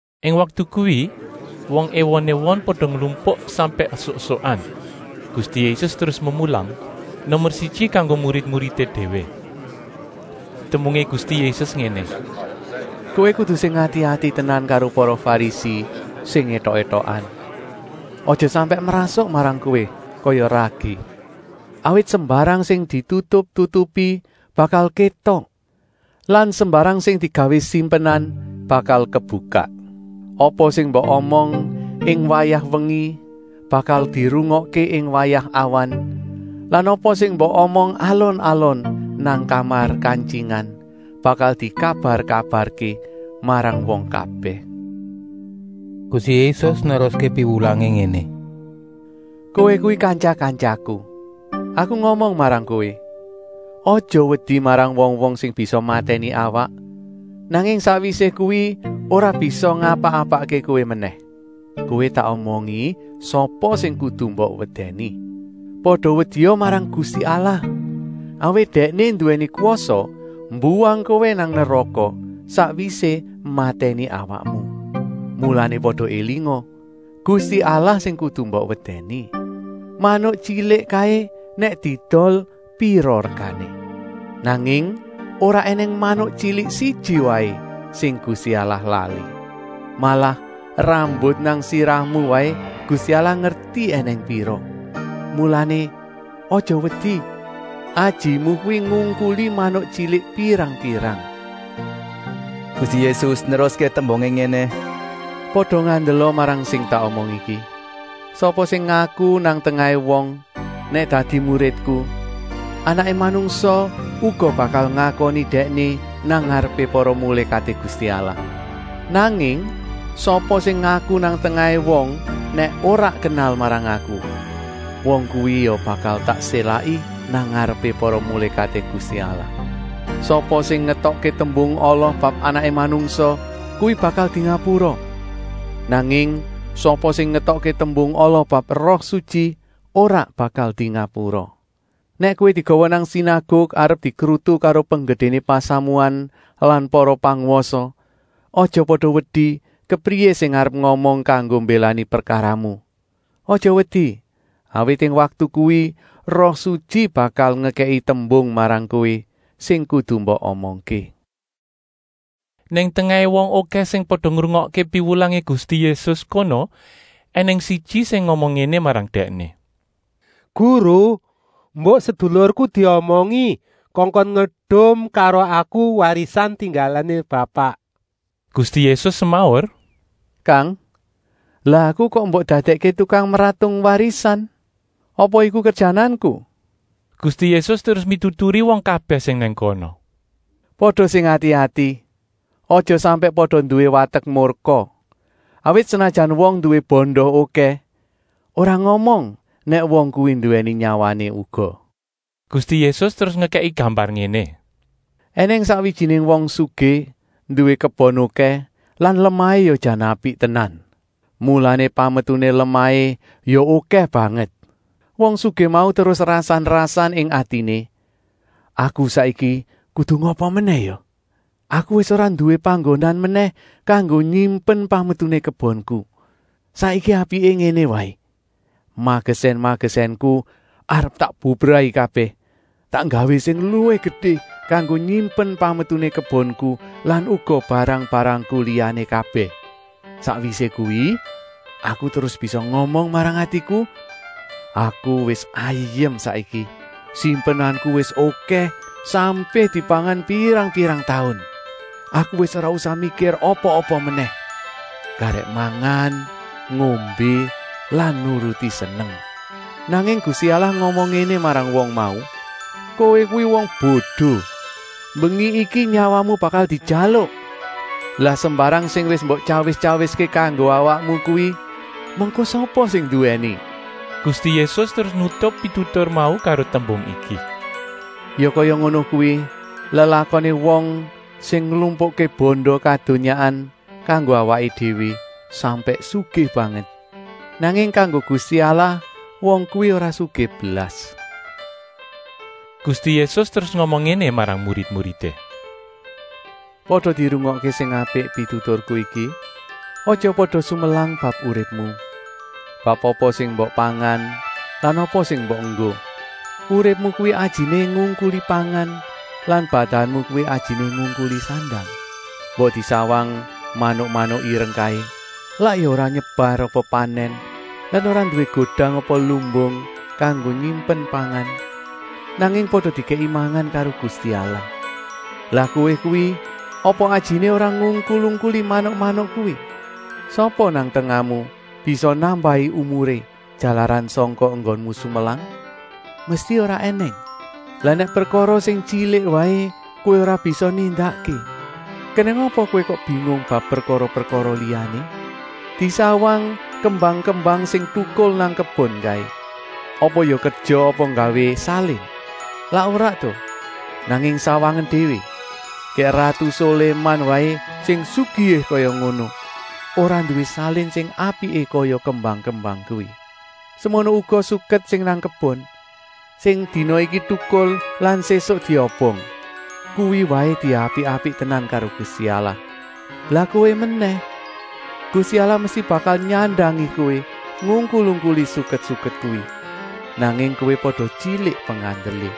Ing waktu kuwi wong èwon-èwon pada nglumpuk sampèk esuk-esukan. Gusti Yésus terus memulang, nomer siji kanggo murid-muridé déwé. Tembungé Gusti Yésus ngéné: “Kowé kudu sing ati-ati tenan karo para Farisi sing étok-étokan, aja sampèk mrasuk marang kowé kaya ragi. Awit sembarang sing ditutup-tutupi bakal kétok lan sembarang sing digawé simpenan bakal kebukak. Apa sing mbok omong ing wayah mbengi bakal dirungokké ing wayah awan lan apa sing mbok omong alon-alon nang kamar kantyingan bakal dikabar-kabarké marang wong kabèh.” Gusti Yésus neruské piwulangé ngéné: “Kowé kuwi kantya-kantyaku! Aku ngomong marang kowé: aja wedi marang wong-wong sing bisa matèni awak, nanging sakwisé kuwi ora bisa ngapa-apakké kowé menèh. Kowé tak omongi sapa sing kudu mbok wedèni. Pada wedia marang Gusti Allah, awit Dèkné nduwèni kwasa mbuwang kowé nang neraka, sakwisé matèni awakmu. Mulané pada élinga, Gusti Allah sing kudu mbok wedèni. “Manuk tyilik kaé nèk diedol pira regané? Nanging ora ènèng manuk tyilik siji waé sing Gusti Allah lali. Malah rambut nang sirahmu waé Gusti Allah ngerti ènèng pira. Mulané aja wedi, ajimu kuwi ngungkuli manuk tyilik pirang-pirang.” Gusti Yésus neruské tembungé ngéné: “Pada ngandela marang sing tak omong iki! Sapa sing ngaku nang tengahé wong nèk dadi muridku, Anaké Manungsa uga bakal ngakoni dèkné nang ngarepé para mulékaté Gusti Allah. Nanging sapa sing ngaku nang tengahé wong nèk ora kenal marang Aku, wong kuwi ya bakal tak sélaki nang ngarepé para mulékaté Gusti Allah. “Sapa sing ngetokké tembung ala bab Anaké Manungsa, kuwi bakal dingapura. Nanging sapa sing ngetokké tembung ala bab Roh Sutyi ora bakal dingapura. “Nèk kowé digawa nang sinaguk arep dikrutu karo penggedéné pasamuan lan para pangwasa, aja pada wedi kepriyé sing arep ngomong kanggo mbélani prekaramu. Aja wedi, awit ing waktu kuwi Roh Sutyi bakal ngekèki tembung marang kowé, sing kudu mbok omongké.” Nang tengahé wong okèh sing pada ngrungokké piwulangé Gusti Yésus kono ènèng siji sing ngomong ngéné marang Dèkné: “Guru, mbok sedulurku diomongi kongkon ngedum karo aku warisan tinggalané bapak.” Gusti Yésus semaur: “Kang, lah Aku kok mbok dadèkké tukang mratung warisan? Apa iku kerjananku?” Gusti Yésus terus mituturi wong kabèh sing nang kono: “Pada sing ati-ati, aja sampèk pada nduwé watek murka, awit senajan wong nduwé banda okèh, ora ngomong nèk wong kuwi nduwèni nyawané uga.” Gusti Yésus terus ngekèki gambar ngéné: “Enèng sakwijiné wong sugih nduwé kebon okèh lan lemahé ya jan apik tenan. Mulané pametuné lemahé ya okèh banget. Wong sugih mau terus rasan-rasan ing atiné: ‘Aku saiki kudu ngapa menèh ya? Aku wis ora nduwé panggonan menèh kanggo nyimpen pametuné kebonku. Saiki apiké ngéné waé: magesèn-magesènku arep tak bubrahi kabèh, tak nggawé sing luwih gedé kanggo nyimpen pametuné kebonku lan uga barang-barangku liyané kabèh. Sakwisé kuwi aku terus bisa ngomong marang atiku: Aku wis ayem saiki. Simpenanku wis okèh, sampé dipangan pirang-pirang taun. Aku wis ora usah mikir apa-apa menèh. Garèk mangan, ngombé lan nuruti seneng.’ Nanging Gusti Allah ngomong ngéné marang wong mau: ‘Kowé kuwi wong bodo. Mbengi iki nyawamu bakal dijaluk. Lah sembarang sing wis mbok tyawis-tyawiské kanggo awakmu kuwi mengko sapa sing nduwèni?’” Gusti Yésus terus nutup pitutur mau karo tembung iki: “Ya kaya ngono kuwi lelakoné wong sing nglumpukké banda kadonyaan kanggo awaké déwé sampèk sugih banget, nanging kanggo Gusti Allah wong kuwi ora sugih blas.” Gusti Yésus terus ngomong ngéné marang murid-muridé: “Pada dirungokké sing apik pituturku iki: Aja pada sumelang bab uripmu, bab apa sing mbok pangan lan apa sing mbok enggo. Uripmu kuwi ajiné ngungkuli pangan lan badanmu kuwi ajiné ngungkuli sandang. Mbok disawang manuk-manuk ireng kaé, lak ya ora nyebar apa panèn lan ora nduwé godang apa lumbung kanggo nyimpen pangan, nanging pada dikèki mangan karo Gusti Allah. Lah kowé kuwi apa ajiné ora ngungkul-ungkuli manuk-manuk kuwi? Sapa nang tengahmu bisa nambahi umuré jalaran sangka enggonmu sumelang? Mesti ora ènèng. Lah nèk prekara sing tyilik waé kowé ora bisa nindakké, kenèng apa kowé kok bingung bab prekara-prekara liyané? Disawang kembang-kembang sing tukul nang kebon kaé. Apa ya kerja apa nggawé salin? Lak ora ta. Nanging sawangen déwé, gèk ratu Soléman waé sing sugihé kaya ngono, ora nduwé salin sing apiké kaya kembang-kembang kuwi. Semono uga suket sing nang kebon, sing dina iki tukul lan sésuk diobong. Kuwi waé diapik-apik tenan karo Gusti Allah. Lah kowé menèh. Gusti Allah mesti bakal nyandangi kowé ngungkul-ungkuli suket-suket kuwi. Nanging kowé pada tyilik pengandelé.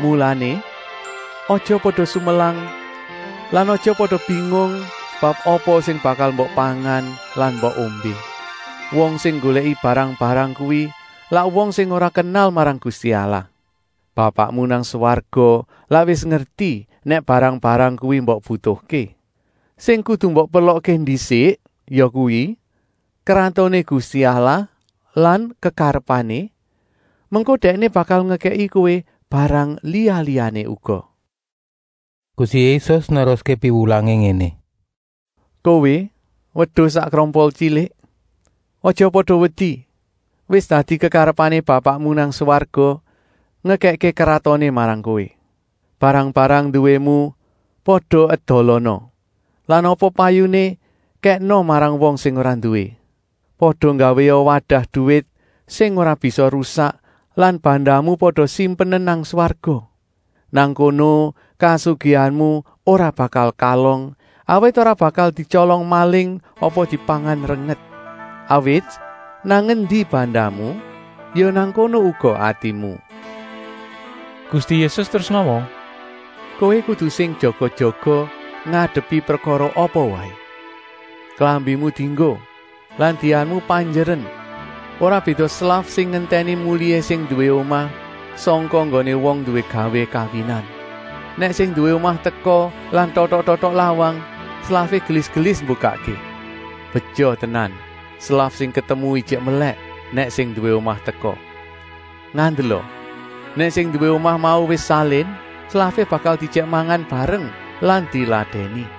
“Mulané, aja pada sumelang lan aja pada bingung bab apa sing bakal mbok pangan lan mbok ombé. Wong sing nggolèki barang-barang kuwi lak wong sing ora kenal marang Gusti Allah. Bapakmu nang swarga lak wis ngerti nèk barang-barang kuwi mbok butuhké. Sing kudu mbok perlokké ndisik yakuwi, Kratoné Gusti Allah lan kekarepané, mengko Dèkné bakal ngekèki kowé barang liya-liyané uga.” Gusti Yésus neruské piwulangé ngéné: “Kowé wedus sak krompol tyilik, aja pada wedi. Wis dadi kekarepané Bapakmu nang swarga ngekèkké kratoné marang kowé. Barang-barang nduwému pada edolana lan apa payuné kèkna marang wong sing ora nduwé. Pada nggawéa wadah duwit sing ora bisa rusak lan bandamu pada simpenen nang swarga. Nang kono kasugihanmu ora bakal kalong, awit ora bakal dityolong maling apa dipangan renget. Awit nang endi bandamu, ya nang kono uga atimu.” Gusti Yésus terus ngomong ngéné: “Kowé kudu sing jaga-jaga ngadepi prekara apa waé. Klambimu dienggo lan dianmu panjeren. Ora béda slaf sing ngentèni mulihé sing nduwé omah sangka nggoné wong nduwé gawé kawinan. Nèk sing nduwé omah teka lan totok-totok lawang, slafé gelis-gelis mbukakké. Beja tenan slaf sing ketemu ijik melèk nèk sing nduwé omah teka. Ngandela, nèk sing nduwé omah mau wis salin, slafé bakal diejèk mangan bareng lan diladèni.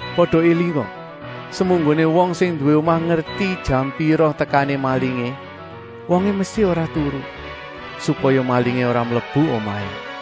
Pada élinga, semunggoné wong sing nduwé omah ngerti jam pira tekané malingé, wongé mesti ora turu, supaya malingé ora mlebu omahé.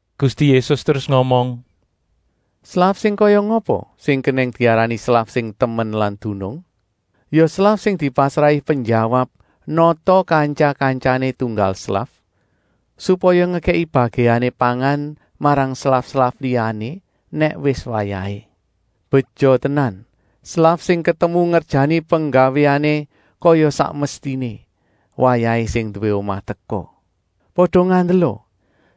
Gusti Yésus terus ngomong: “Slaf sing kaya ngapa sing kenèng diarani slaf sing temen lan dunung? Ya slaf sing dipasrahi penjawab nata kantya-kantyané tunggal slaf, supaya ngekèki bagèané pangan marang slaf-slaf liyané nèk wis wayahé. Beja tenan slaf sing ketemu ngerjani penggawéané kaya sak mestiné, wayahé sing nduwé omah teka. Pada ngandela,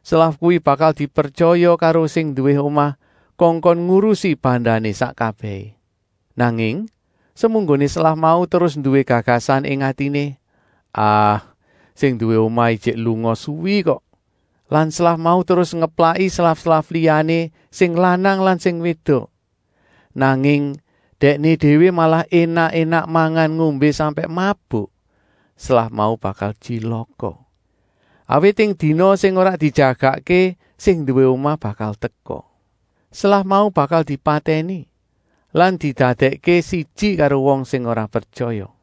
slaf kuwi bakal dipretyaya karo sing nduwé omah kongkon ngurusi bandané sak kabèhé. Nanging semunggoné slaf mau terus nduwé gagasan ing atiné: ‘Ah, sing nduwé omah ijik lunga suwi kok’ lan slaf mau terus ngeplaki slaf-slaf liyané sing lanang lan sing wédok, nanging dèkné déwé malah énak-énak mangan-ngombé sampèk mabuk, slaf mau bakal tyilaka. Awit ing dina sing ora dijagakké sing nduwé omah bakal teka. Slaf mau bakal dipatèni lan didadèkké siji karo wong sing ora pretyaya.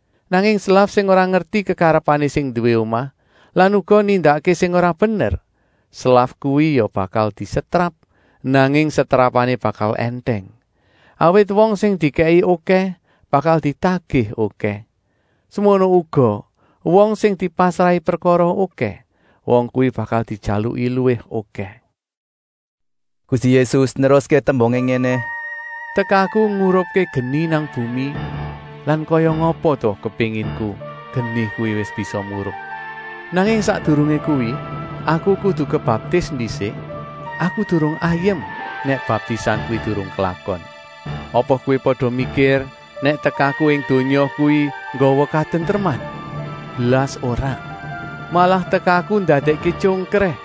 Nanging slaf sing ora ngerti kekarepané sing nduwé omah lan uga nindakké sing ora bener, slaf kuwi ya bakal disetrap, nanging setrapané bakal èntèng. Awit wong sing dikèki okèh bakal ditagih okèh. Semono uga wong sing dipasrahi prekara okèh, wong kuwi bakal dijaluki luwih okèh.” Gusti Yésus terus neruské tembungé: “Tekaku ngurupké geni nang bumi lan kaya ngapa ta kepénginku geni kuwi wis bisa murup. Nanging sakdurungé kuwi, Aku kudu kebaptis ndisik, Aku durung ayem nèk baptisan kuwi durung klakon. Apa kowé pada mikir nèk tekaku ing donya kuwi nggawa katentreman? Blas ora! Malah tekaku ndadèkké tyongkrèh.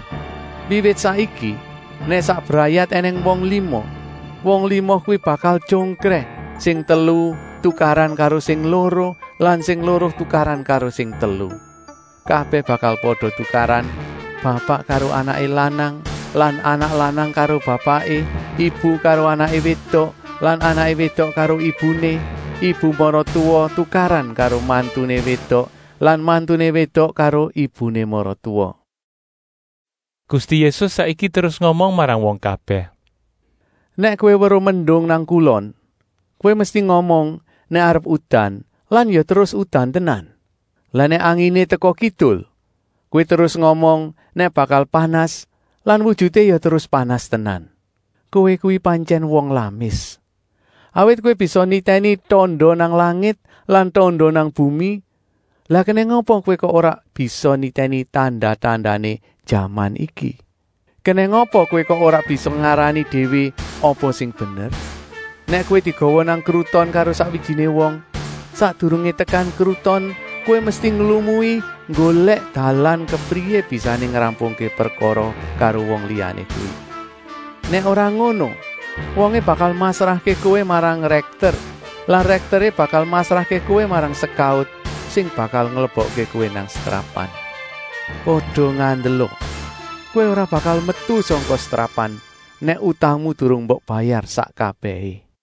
Wiwit saiki nèk sak brayat ènèng wong lima, wong lima kuwi bakal tyongkrèh, sing telu tukaran karo sing loro lan sing loro tukaran karo sing telu. Kabèh bakal pada tukaran: bapak karo anaké lanang lan anak lanang karo bapaké, ibu karo anaké wédok lan anaké wédok karo ibuné, ibu maratuwa tukaran karo mantuné wédok lan mantuné wédok karo ibuné maratuwa.” Gusti Yésus saiki terus ngomong marang wong kabèh: “Nèk kowé weruh mendung nang kulon, kowé mesti ngomong nèk arep udan lan ya terus udan tenan. Lah nèk anginé teka kidul, kowé terus ngomong nèk bakal panas lan wujuté ya terus panas tenan. Kowé kuwi pantyèn wong lamis. Awit kowé bisa nitèni tanda nang langit lan tanda nang bumi, lah kenèng apa kowé kok ora bisa nitèni tanda-tandané jaman iki? “Kenèng apa kowé kok ora bisa ngarani déwé apa sing bener? Nèk kowé digawa nang kruton karo sakwijiné wong, sakdurungé tekan kruton kowé mesti nglumui nggolèk dalan kepriyé bisané ngrampungké prekara karo wong liyané kuwi. Nèk ora ngono, wongé bakal masrahké kowé marang rèkter lan rèkteré bakal masrahké kowé marang sekaut sing bakal nglebokké kowé nang setrapan. Pada ngandela, kowé ora bakal metu sangka setrapan, nèk utangmu durung mbok bayar sak kabèhé.”